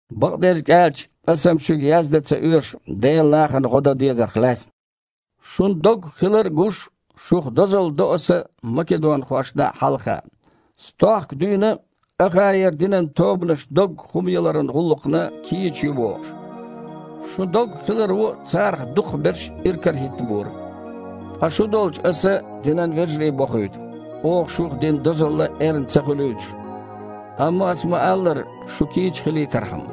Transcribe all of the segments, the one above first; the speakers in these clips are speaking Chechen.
Бакъдерг аьлча, аса-м шуьга яздан а ца оьшу Делан нахана гІо дан дезарх лаьцна. Шун доггах хилар а гуш, шух дозалла до аса македонхошна хьалха: «Стохка дуьйна а Ахаера динан тобанаш доггах хІума яларан гІуллакхна кийча ю» – бохуш. Шун доггах хиларо царах дукхахберш иракарахІиттабора. Ткъа шу долчу аса динан вежарий бохуьйту, оха шух дина дозалла эрна а ца хуьлуьйтуш, амма, аса ма-аллара, шу кийча хилийтархьама.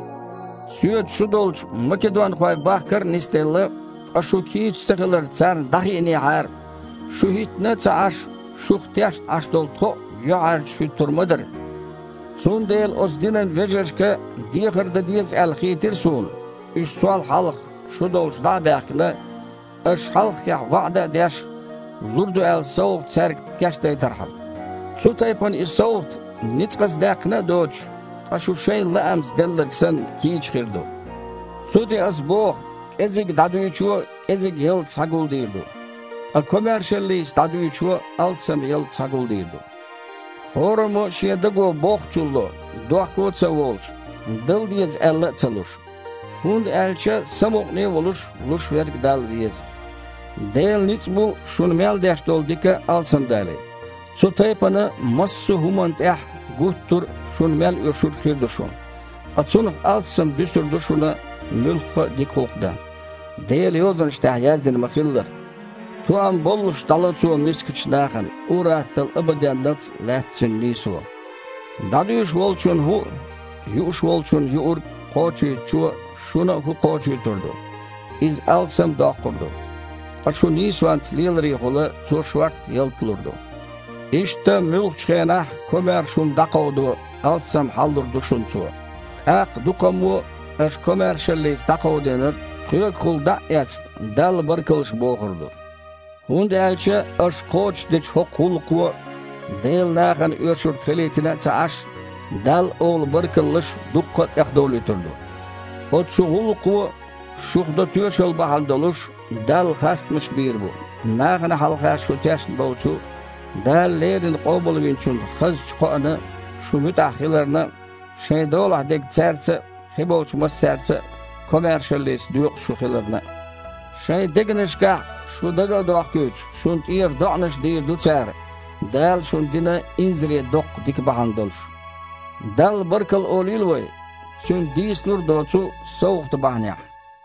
Соьца шу долчу македонхой бахкар а нисделла, ткъа шу кийча ца хилар царна дІахиънехьара, шу хІиттина а ца Іаш, шух тешна Іаш долу тхо а юьхьІаьржачу хІуьттур ма дара! Цундела оцу динан вежаршка дехар дан деза аьлла хийтира суна, уьш сол хьалха шу долчу дІа а баьхкина, аша хьалххехь ваІда а деш, лур ду аьлла совгІат цаьрга кечдайтархьама. Цу тайпана и совгІат, ницкъаца даьккхина а доцуш, ткъа шун-шайн лаамца делларг санна кийча хир ду. Цу тІе аса боху: кІезиг дІадуьйчо – кІезиг ялта схьагулдийр ду, ткъа комаьршаллица дІадуьйчо – алссам ялта схьагулдийр ду. ХІораммо а шен даго боххучул ло, дохко а ца волуш, дала деза аьлла а ца луш. ХІунда аьлча самукъане а волуш луш верг Далла веза. Делан ницкъ бу шуна мел деш долу дика алсамдалийта. Цу тайпана, массо а хІуманна тІехь а, гуттара а шуна мел оьшург хир ду шун, ткъа цунах алссам дуьсур ду шуна муьлхха а дика гІуллакх дан. Делан Йозанаш тІехь яздина ма-хиллара: «Тоам боллуш дІало цо мискачу нахана, ур-атталла абаденналц а лаьтта цуьнан нийсо». ДІадуьйш волчунна хІу а, юуш волчунна юург а Кхочуьйтучо шуна а хІу кхочуьйтур ду, иза алсам а доккхур ду, ткъа шун нийсонца леларехула Цо шортта ялта лур ду. Иштта муьлххачу а хенахь комаьрша хІума дІакховдо алссам хьал а лур ду шуна Цо. ТІаккха дуккхаммо а, аша комаьршаллица дІакховдийнарг тхоьгахула дІа а эцна, Далла баркаллаш бохур ду. ХІунда аьлча аша кхочушдечу хІокху гІуллакхо, Делан нахана оьшург хилийтина а ца Іаш, Далла олу баркаллаш дуккха а тІехдовлуьйтур ду. Оцу шун гІуллакхо шух до тоьшалла бахьана долуш, Далла хастамаш бийр бу, нахана хьалха шу тешна болчу Дала леррина Къобалвинчун хазачу кхоана шу муьтІахь хиларна а, шайн долахь дерг цаьрца а, кхиболчу массаьрца а комаьршаллица доькъуш шу хиларна а. Шайн дегнашкахь шу дага а дохкуьйтуш, шуна тІера доІанаш дийр ду цара, Дала шуна дина инзаре доккха дика бахьана долуш. Далла баркалла олийла вай, Цуьнан дийцалур а доцу совгІат бахьанехь!